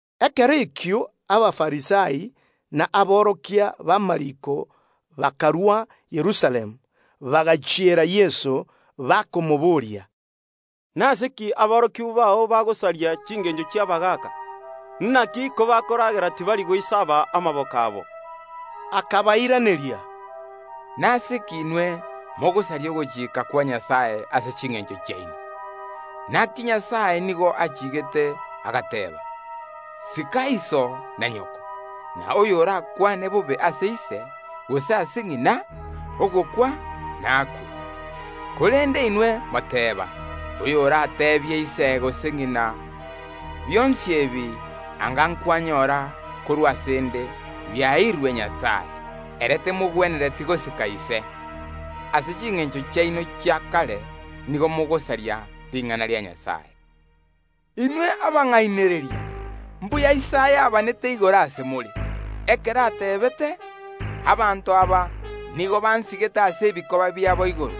Ekero ekio Abafarisai na aborokia b’amariiko bakarwa Yerusalemu, bagachiera Yeso, bakamoboria, “Nase ki aborokigwa bao bagosaria chingencho chi’abagaaka? Inaki kobakoragera tibari goisaaba amaboko abo buna egwenerete.” Akabairaneria, Nase ki inwe mogosaria ogochika kwa Nyasae ase chingencho chiaino? Inaki Nyasae nigo achiigete, agateeba: Sika iso na nyoko, na: Oyorakwane bobe ase ise, gose ase ng’ina, ogokwa nakwe. Korende inwe moteba: Oyoratebie ise gose ng’ina: Bionsi ebi anga kwanyora korwa ase ’nde biaeirwe Nyasae, ere temogwenereti gosika ise. Ase chingencho chiaino chia kare nigo mogosaria ring’ana ria Nyasae. Inwe abang’ainereria! Mbuya Isaya abanete igoro ase more, ekero ateebete: Abanto aba nigo bansigete ase ebikoba biabo igoro,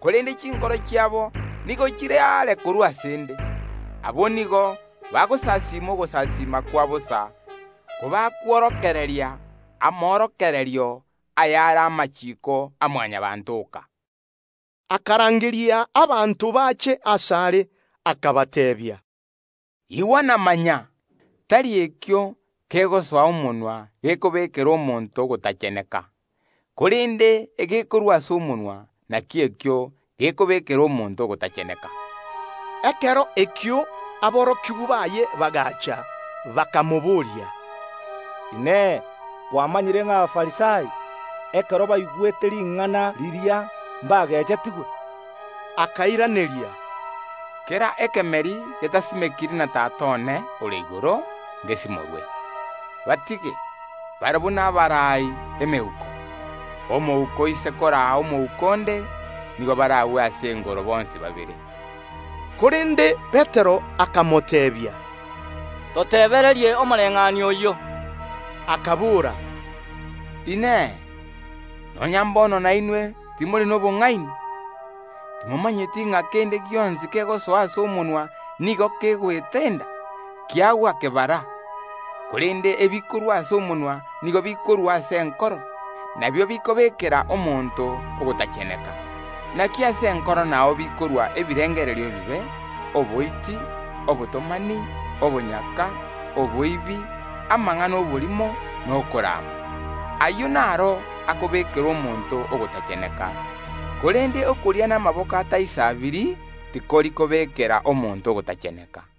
korende chinkoro chiabo nigo chire aare korwa ase ’nde. Abwo nigo bagonsasiima ogosasiima kwa bosa kobakworokereria amorokererio ayare amachiiko a Mwanyabaanto oka. Akarangeria abanto bache asare, akabateebia, “Igwa na manya: Tari ekio kegosoa omonwa gekobekera omonto ogotacheneka, korende egekorwa ase omonwa nakio ekio gekobekera omonto ogotacheneka.” Ekero ekio aborokigwa baye bagaacha, bakamoboria, “Inee! Kwamanyire ng’a Abafarisai, ekero baigwete ring’ana riria, mbagechetigwe?” Akairaneria, “Kera ekemeri getasimekiri na Tata one ore igoro ngesimorwe. Batige; barabwo nabaraai emeuko. Omouko oise koraa omouko onde, nigo baragwe ase engoro bonsi babere.” Korende Petero akamoteebia, “Totebererie omobayeeno oyio.” Akabora, “Inee! Nonya mbono nainwe timori nobong’aini? Timomanyeti ng’a kende gionsi kegosoa ase omonwa nigo kegoeta enda, kiagwa kebara? Korende ebikorwa ase omonwa nigo bikorwa ase enkoro; nabio bikobekera omonto ogotacheneka. Inaki ase enkoro nao bikorwa ebirengerio ebibe, oboiti, obotomani, obonyaka, oboibi, amang’ana y’oborimo, na okorama. Ayio naro akobekera omonto ogotacheneka korende okoria namaboko ataisaabiri tikori kobekera omonto ogotacheneka.”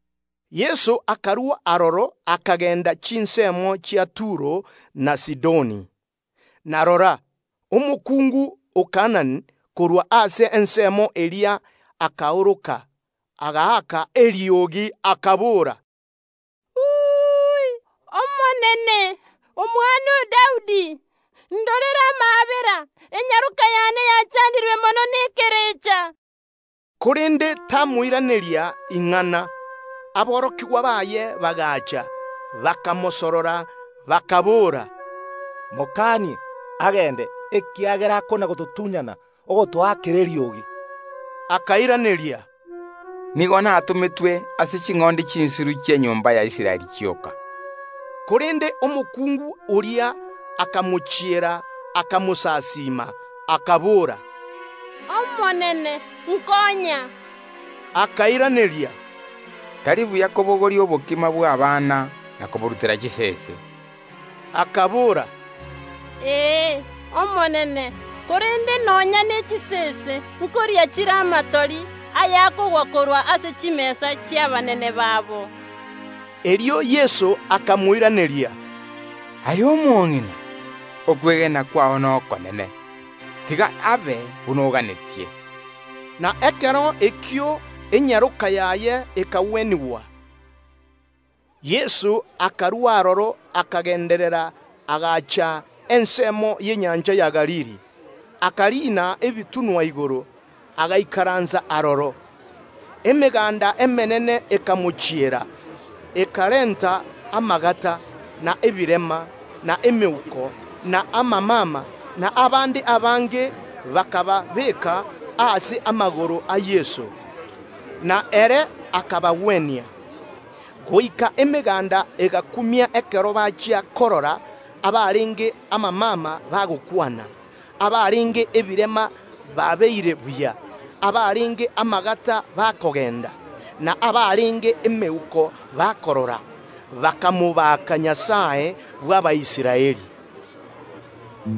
Yeso akarua aroro, akagenda chinsemo chia Turo na Sidoni. Na rora, omokungu o Kaanani korwa ase ensemo eria akaoroka, agakaa eriogi, akabora, “Omonene, omwana o Daudi, indorere amaabera; enyaroka y’ane yachandirwe mono nekerecha.” Korende tamoiraneria ing’ana. Aborokigwa baye bagaacha, bakamosorora, bakaboora, “Mokanie, agende, ekiagera akona‐gototunyana ogotoakera eriogi.” Akairaneria, “Nigo natometwe ase ching’ondi chinsiru chi’enyomba ya Israeli chioka.” Korende omokungu oria akamochiera agatugama inse ase are, akabora, “Omonene, nkonya.” Yeso akairaneria, “Tari buya kobogoria endagera y’abana na koyerutera chisese.” Omokungu oria akabora, “Ee, Omonene, korende nonya ne chisese nkoria chire amatori ayakogwa korwa ase chimesa chi’abanene babo.” Erio Yeso akamoiraneria, “Aye omong’ina, okwegena kwao nokonene! Tiga abe buna oganetie.” Na ekero ekio enyaroka yaye ekagwenigwa. Yeso akarua aroro akagenderera, agacha ensemo y’enyancha ya Galili, akariina ebitunwa igoro, agaikaransa aroro. Emeganda emenge ekamochiera, ekarenta amagata, na ebirema, na emeuko, na amamama, na abande abange, bakababeeka ase amagoro a Yeso, na ere akabagwenia. Goika emeganda egakumia ekero bachia korora abarenge amamama bagokwana, abarenge ebirema babeire buya, abarenge amagata bakogenda, na abarenge emeuko bakorora; bakamotogia Nyasae bw’Abaisraeli.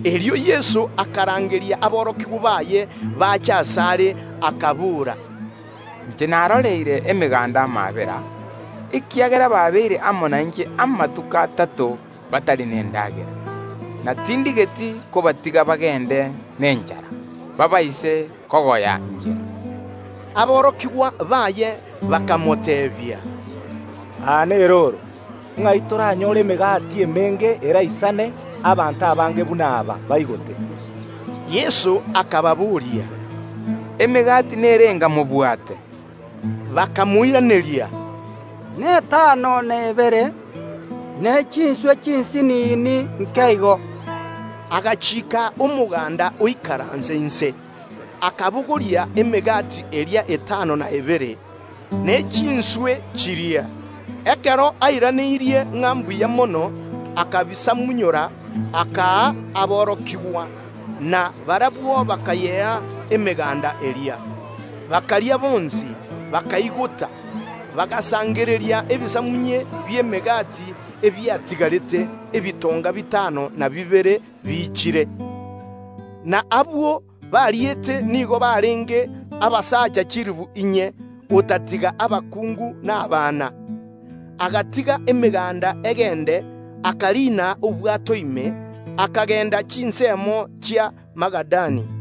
Erio Yeso akarangeria aborokigwa baye bache asare, akabora, “Inche naroreire emeganda amaabera, ekiagera babeire amo nainche amatuko atato, batari nendagera; na tindigeti kobatiga bagende nenchara, baabaise kogoya inchera.” Aborokigwa baye bakamoteebia, “Aa nerooro, ng’ai toranyore emegati emenge eraisane abanto abange buna aba baigote?” Yeso akababoria, “Emegati nerenga mobwate?” Bakamoiraneria, “Netano na ebere, ne chinswe chinsinini nke igo.” Agachiika omoganda oikaranse inse. Akabogoria emegati eria etano n’ebere, ne chinswe chiria. Ekero airaneirie ng’a mbuya mono, akabisamunyora, akaa aborokigwa, na barabwo bakayea emeganda eria. Bakaria bonsi, bakaigota; bagasangereria ebisamunye bi’emegati ebiatigarete, ebitonga bitano na bibere biichire. Na abwo bariete nigo barenge abasacha chilifu inye, otatiga abakungu na abana. Erio Yeso gatigire emeganda egende, akariina obwato ime, akagenda chinsemo chia Magadani.